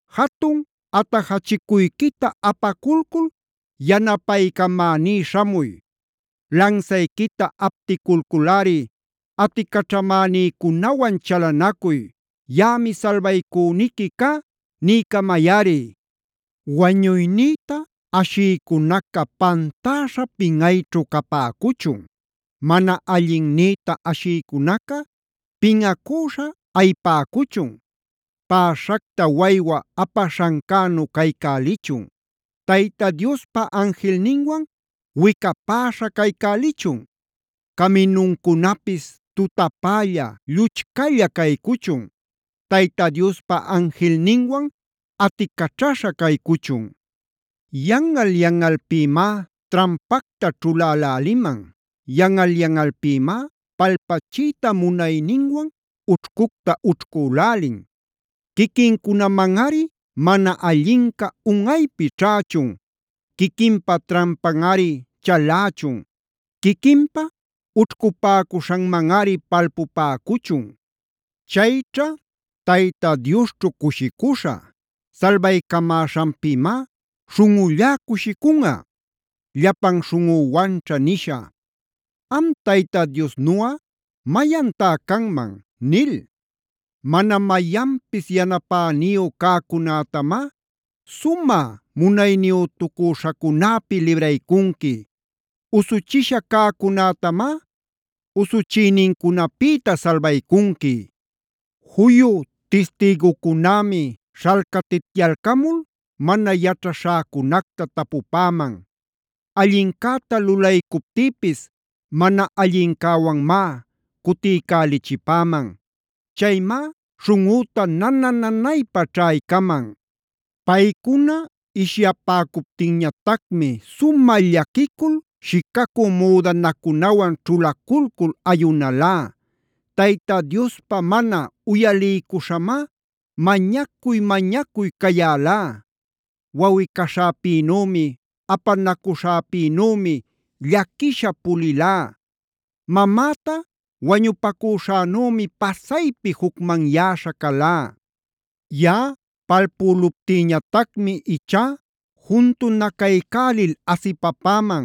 Jatun atajachicuyquita apaculcul yanapaycamäní śhamuy. Lansayquita apticulculꞌari aticaćhamänïcunawan chalanacuy. “Yaꞌami salbaycüniqui cá” niycamayꞌari. Wañuynïta ashïcunaca pantäśha pinꞌayćhu capäcuchun. Mana allinnïta ashïcunaca pinꞌacüśha ayipäcuchun. Päśhacta waywa apaśhancänu caycälichun; Tayta Diospa anjilninwan wicapäśha caycälichun. Caminuncunapis tutapälla, lluchcalla caycuchun; Tayta Diospa anjilninwan aticaćhaśha caycuchun. Yanꞌal-yanꞌalpïmá trampacta ćhuläläliman. Yanꞌal-yanꞌalpïmá palpachiyta munayninwan ućhcucta ućhcülälin. Quiquincunamanꞌari mana allinca unꞌaypi ćhächun, quiquinpa trampanꞌari chalächun, quiquinpa ućhcupäcuśhanmanꞌari palpupäcuchun. Chayćha Tayta Diosćhu cushicuśhä. Salbaycamäśhanpïmá śhunꞌullá cushicunꞌa. Llapan śhunꞌüwanćha nisha: “¿Am Tayta Diosnuꞌa mayantá canman?” nil. Mana mayanpis yanapäniyu cäcunätamá sumä munayniyütucüśhacunäpi libraycunqui. Usuchisha cäcunätamá usuchïnincunapïta salbaycunqui. Juyu tistïgucunämi śhalcatityalcamul mana yaćhaśhäcunacta tapupäman. Allincäta lulaycuptïpis mana allincäwanmá cutiycälichipäman. Chaymá śhunꞌüta nana-nanaypa ćhaycaman. Paycuna ishyapäcuptinñatacmi sumä llaquicul shicacü müdanacunawan ćhulaculcul ayunalá; Tayta Diospa mana uyaliycuśhamá mañacuy-mañacuy cayälá. Wawꞌi-caśhäpïnümi, apanacuśhäpïnümi llaquisha pulilá. Mamäta wañupacüśhanümi pasaypi jucmanyäśha calá. Yaꞌa palpüluptïñatacmi ichá juntunacaycälil asipapäman.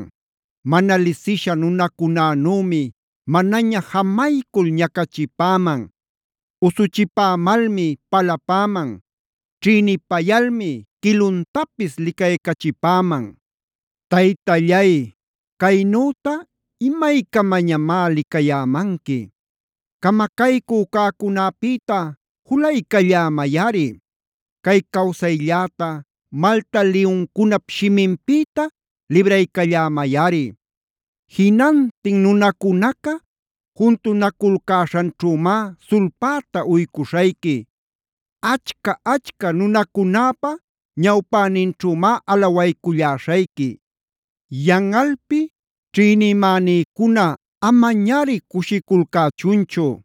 Mana lisisha nunacunänümi manaña jamaycul ñacachipäman. Usuchipämalmi palapäman. Ćhïnipayalmi quiluntapis licaycachipäman. Taytallay, ¿caynüta imaycamañamá licayämanqui? Camacaycü cäcunäpïta julaycallämayꞌari. Cay cawsaylläta malta liyuncunap shiminpïta libraycallämayꞌari. Jinantin nunacunaca juntunaculcäśhanćhümá sulpäta uycuśhayqui. Achca-achca nunacunäpa ñawpäninćhümá alawayculläśhayqui. Yanꞌalpi ćhïnimänïcuna amañari cushiculcächunchu.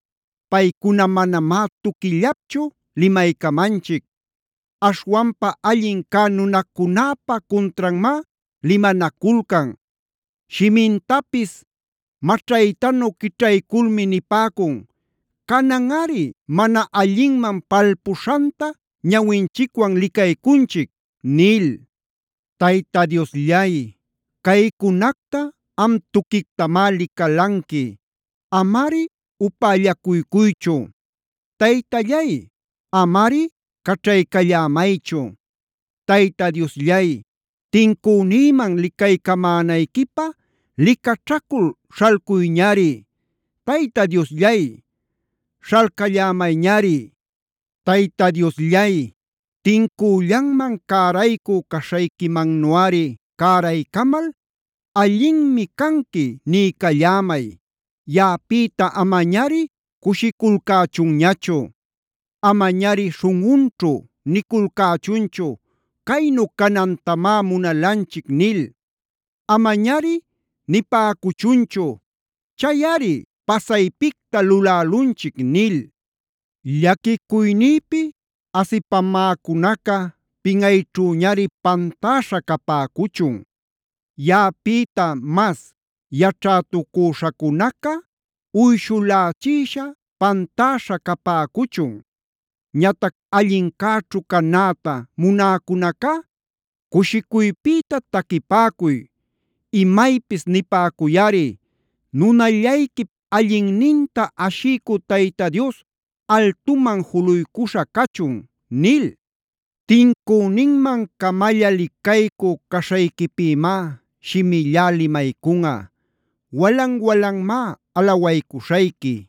Paycuna manamá tuquillapchu limaycamanchic. Aśhwanpa allin cä nunacunäpa cuntranmá limanaculcan. Shimintapis maćhaytanu quićhayculmi nipäcun: “Cananꞌari mana allinman palpuśhanta ñawinchicwan licaycunchic” nil. Tayta Diosllay, caycunacta am tuquictamá licalanqui. Amari upällacuycuychu. Taytallay, amari caćhaycallämaychu. Tayta Diosllay, tincünïman licaycamänayquipä licaćhacul śhalcuyñari. Tayta Diosllay, śhalcallämayñari. Tayta Diosllay, tincüllanman cäraycü caśhayquimannuꞌari cäraycamal: “Allinmi canqui” niycallämay. Yaꞌapïta amañari cushiculcächunñachu. Amañari śhunꞌunćhu niculcächunchu: “Caynu canantamá munalanchic” nil. Amañari nipäcuchunchu: “Chayꞌari pasaypicta lulälunchic” nil. Llaquicuynïpi asipämäcunaca pinꞌayćhüñari pantäśha capäcuchun. Yaꞌapïta mas yaćhätucüśhäcunaca uyshulächisha pantäśha capäcuchun. Ñatac allincäćhu canäta munäcunacá cushicuypïta taquipäcuy. Imaypis nipäcuyꞌari: “Nunallayquip allinninta ashiycü Tayta Dios altuman juluycuśha cachun” nil. Tincüninman-camalla licaycü caśhayquipïmá shimillá limaycunꞌa. Walan-walanmá alawaycuśhayqui.